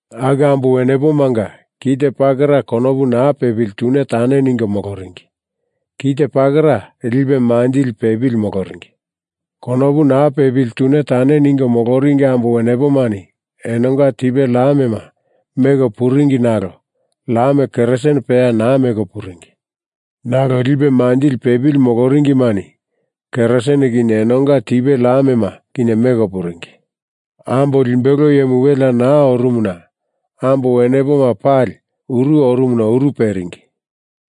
Aku ambo wenepomanga kite pakera konopu naa pepili tune tane ningo moloringi; kite pakera lipe manjili pepili moloringi. Konopu naa pepili tune tane ningo moloringi ambo wenepomani enonga tipe lamema meko puringi nalo lam kerasin peya naa meko puringi. Nalo lipe manjili pepili moloringimani kerasin kinye enonga tipe lamema kinye meko puringi. Ambo limbelo iyemu welea naa orumuna ambo wenepoma pali uru orumuna uru peringi.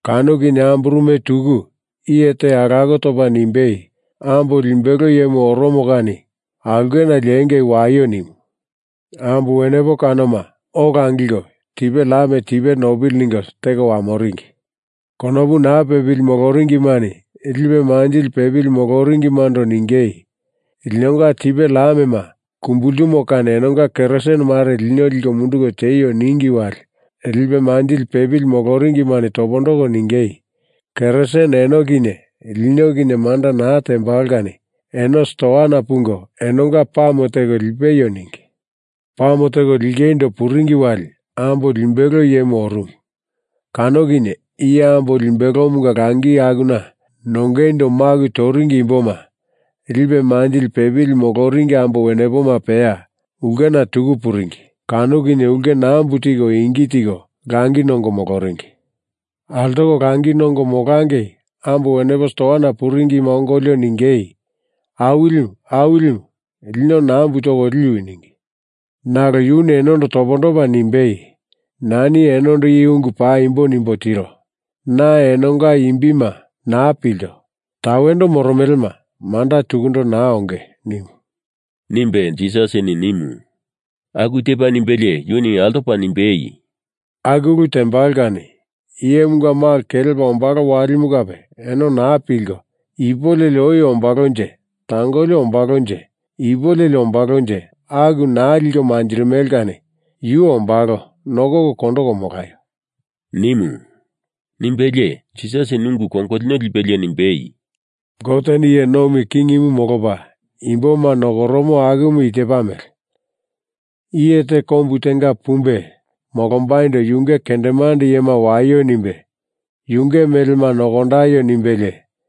Kano kinye amburume tuku iye te alako topa nimbei, ‘Ambo limbelo iyemu oromo kani! Aulkena liengei waio!’ nimu. Ambo wenepo kanoma ola angilko tipe lam tipe nopili ningo teko wamoringi. Konopu naa pepili moloringimani lipe manjili pepili moloringimando ningei, ‘Linonga tipe lamema kumbultumo kani enonga kerasin mare lino liko munduko tieio,’ ningi wali lipe manjili pepili moloringimani topondoko ningei, ‘Kerasin eno kinye lino kinye manda naa tembalo kani eno stuana pungo enonga pame teko lipeio,’ ningi. Pame teko lingeindo puringi wali ambo limbelo iyemu orumu. Kano kinye iye ambo limbelomunga langi akuna nongeindo maku toringi imboma, lipe manjili pepili moloringi ambo wenepoma peya ulkena tuku puringi. Kano kinye ulke nambu tiko ingi tiko langi nongo moloringi. Altoko langi nongo molangei ambo wenepo stuana puringima ongolio ningei, ‘Awilimu, Awilimu, lino nambu toko liwi,’ ningi. Nalo yuni enondo topondopa nimbei, ‘Nani enondo i ungu paimbo nimbo tiro. Na enonga imbima naa pilto. Tawendo moromelema manda tukundo naa onge,’ nimu,” nimbe Jisasini nimu. Aku tepa nimbelie yuni altopa nimbei, “Aku ulu tembalo kani Iyemunga Malo kelepa ombalo walimu kape eno naa pilko, ipu leli oi ombalonje tangoli ombalonje ipu leli ombalonje aku naa liko manjirimele kani Yu ombalo nokoko kondoko molaio,” nimu. Nimbelie Jisasini ungu kongolino lipelie nimbei, “Goteni iye nomi kingimu molopa imboma nokoromo akumu i tepa mele: Iye te kombu tenga pumbe molombaindo yunge kendemande iyema waio nimbe yunge melema nokondaio nimbelie,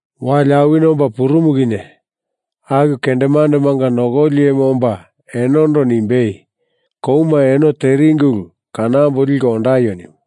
Wali awini omba purumu kinye aku kendemandemanga nokoli iyemu omba enondo nimbei, ‘Kouma eno teringi ulu kanambo liko ondaio,’ nimu.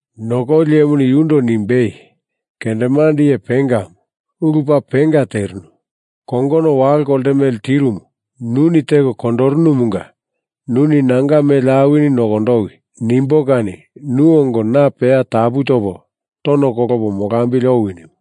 Nokoli iyemuni yundo nimbei, ‘Kendemande iye pengamu, ulu paa penga terinu. Kongono walo kolte mele tirumu nuni teko kondorunumunga nuni nanga mele awini nokondowi nimbo kani nu ongo na peya tapu topo tono kolopo molambili owi,’ nimu.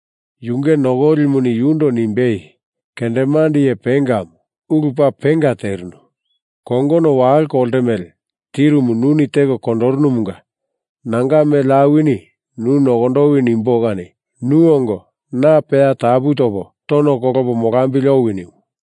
Yunge nokolimuni yundo nimbei, ‘Kendemande iye pengamu, ulu paa penga terinu. Kongono walo kolte mele tirumu nuni teko kondorunumunga nanga mele awini nu nokondowi nimbo kani nu ongo na peya tapu topo tono kolopo molambili owi,’ nimu.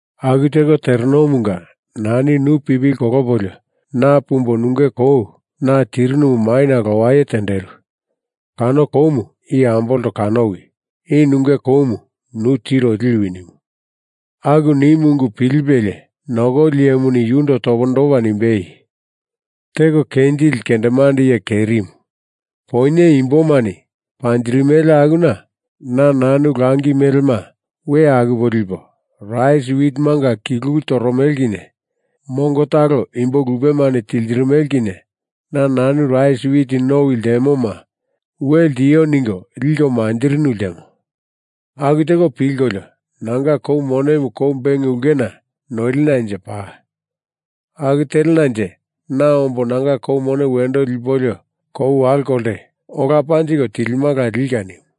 Aku teko terenomunga nani nu pipili kolopolio na pumbo nunge kou na tirinumu maina lowai tenderu. Kano koumu i ambolto kanowi. I nunge koumu nu tiro liwi,’ nimu. Aku nimu ungu pilipelie nokoli iyemuni yundo topondopa nimbei, ‘Teko kenjili kendemande iye kerimu, poinye imbomani panjindirimele akuna na nanu langi melema we akupo lipo; rais witimunga kilulu toromele kinye mongo talo imbo lupemani tiltirimele kinye na nanu rais wit nowi ltemoma we ltio ningo liko manjirinu ltemo. Aku teko pilkolio nanga kou monemu kou beng ulkena noilinanje paa. Aku telenanje na ombo nanga koumu wendo lipolio kou walo kolte ola panjiko tilimala lika,’ nimu.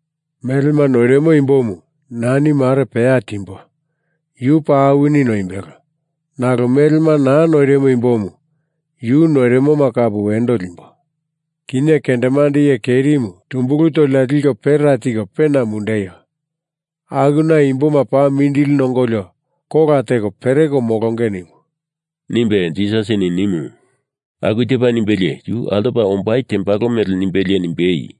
‘Melema noirimo imbomu nani mare peya timbo, yu paa awini noimbelo. Nalo melema naa noirimo imbomu yu noirimoma kape wendo limbo. Kinye kendemande iye kerimu tumbulu tolina liko pera tiko pena mundeio. Akuna imboma paa mindili nongolio kola teko pereko molonge,’ nimu,” nimbe Jisasini nimu. Aku tepa nimbelie yu altopa ombai tembalo mele nimbelie nimbei,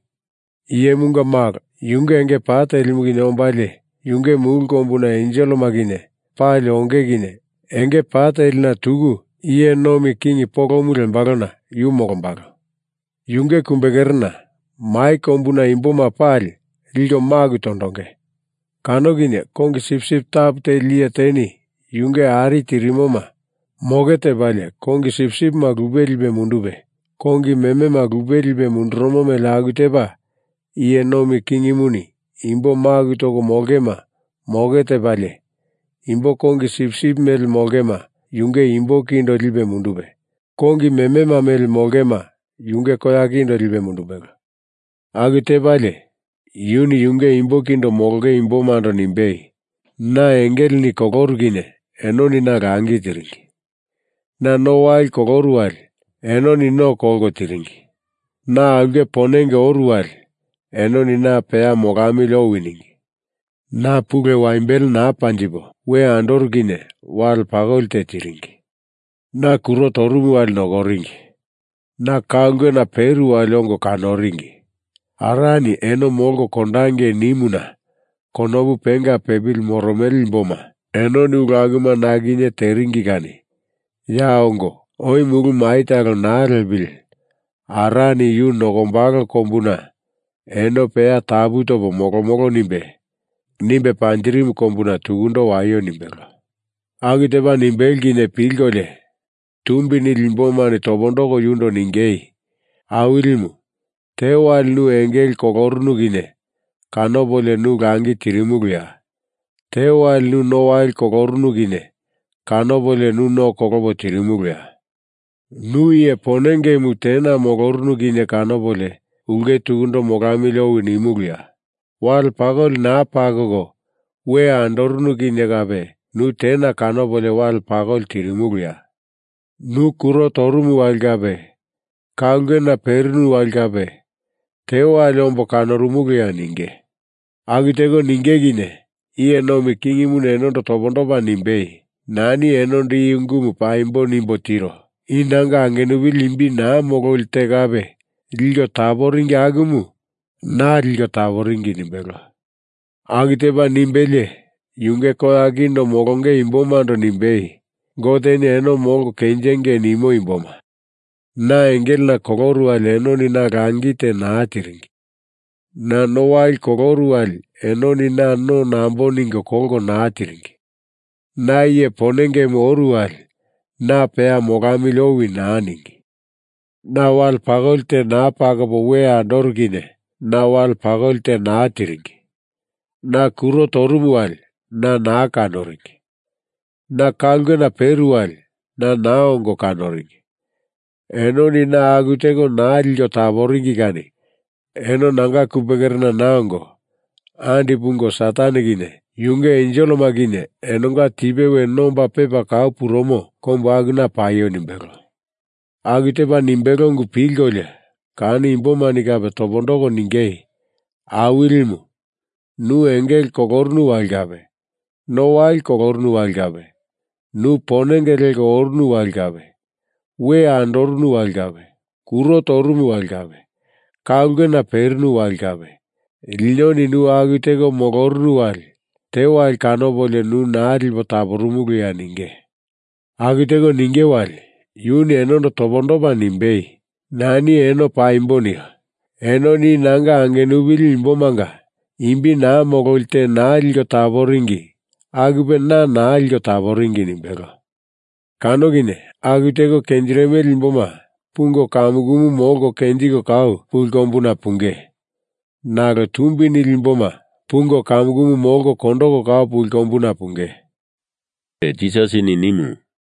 “Iyemunga Malo yunge enge pa telimu kinye ombalie, yunge mulu kombuna enselema kinye pali onge kinye enge pa telina tuku iye nomi king polomu lembalona yu molombalo. Yunge kumbekerena mai kombuna imboma pali liko maku tondonge. Kano kinye kongi sipsip tapu teli iye teni yunge ari tirimoma moke tepalie kongi sipsipima lupe lipe mundupe, kongi memema lupe lipe mundurumo mele aku tepa Iye Nomi Kingimuni imbo maku toko molongema moke tepalie, imbo kongi sipsip mele molongema yunge imbo kindo lipe mundupe, kongi memema mele molongema yunge koya kindo lipe mundumbelo. Aku tepalie, yuni yunge imbo kindo molonge imbomando nimbei, ‘Na engelena koloru kinye enoni na langi tiringi. Na no wali koloru wali enoni no kolko tiringi. Na aulke ponenge oru wali enoni na peya molamili owi ningi. Na pulu waimbele naa panjipo we andoru kinye wale pakoli te tiringi. Na kuro torumu wali nokoringi. Na ka ulkena peru wali ongo kanoringi. Arani eno molko kondangei nimuna konopu penga pepili moromele imboma, enoni ulu akuma na kinye teringi kani, ya ongo, oi mulu mai talo naa lepili Arani yu nokombalo kombuna eno peya tapu topo molomolo nimbe, nimbe panjirimu kombuna tukundo waio,’ nimbelo. Aku tepa nimbelo kinye pilkolio tumbi nili imbomani topondoko yundo ningei, ‘Awilimu, tewali nu engele kolorunu kinye kanopolio nu langi tirimuluya? Tewali nu no wali kolorunu kinye kanopolio nu no kolopo tirimuluya? Nu iye ponengemu tena molorunu kinye kanopolio ulke tukundo molamili owi nimuluya? Wale pakoli naa pakoko we andorunu kinye kape nu tena kanopolio wale pakoli tirimuluya? Nu kuro torumu wali kape, ka ulkena perinu wali kape, tewali ombo kanorumuluya?’ ninge. Aku teko ninge kinye Iye Nomi Kingimuni enondo topondopa nimbei, ‘Nani enondo i ungumu paimbo nimbo tiro. I nanga angenupili imbi naa mololi te kape liko taporingi akumu na liko taporingi,’ nimbelo. Aku tepa nimbelie yunge koya kindo molonge imbomando nimbei, ‘Goteni eno molko kenjingei nimo imboma, na engelena koloru wali enoni na langi te naa tiringi. Na no wali koloru wali enoni na no nambo ningo kolko naa tiringi. Na iye ponengemu oru wali na peya molamili owi naa ningi. Na wale pakoli te naa pakopo we andoru kinye na wale pakoli te naa tiringi. Na kuro torumu wali na naa nokoringi. Na ka ulkena peru wali na naa ongo kanoringi. Enoni na aku teko naa liko taporingi kani eno nanga kumbekerena naa ongo andi pungo, Satan kinye yunge enselema kinye enonga tipe we nomba pepa kau purumo kombu akuna paio,’ nimbelo. Aku tepa nimbelo ungu pilkolio kano imbomani kape topondoko ningei, ‘Awilimu, nu engele kolorunu wali kape, no wali kolorunu wali kape, nu ponenge leko orunu wali kape, we andorunu wali kape, kuro torumu wali kape, ka ulkena perinu wali kape, linoni nu aku teko molorunu wali, tewali kanopolio nu naa lipo taporumuluya?’ ninge. Aku teko ninge wali yuni enondo topondopa nimbei, ‘Nani eno paimbo nio. Enoni i nanga angenupili imbomanga imbi naa mololi te naa liko taporingi akupe na naa liko taporingi,’ nimbelo. Kano kinye aku teko kenjirimele imboma pungo kamukumu molko kenjiko kau puli kombuna punge, nalo tumbi nili imboma pungo kamukumu molko kondoko kau puli kombuna punge,” nimbe Jisasini nimu.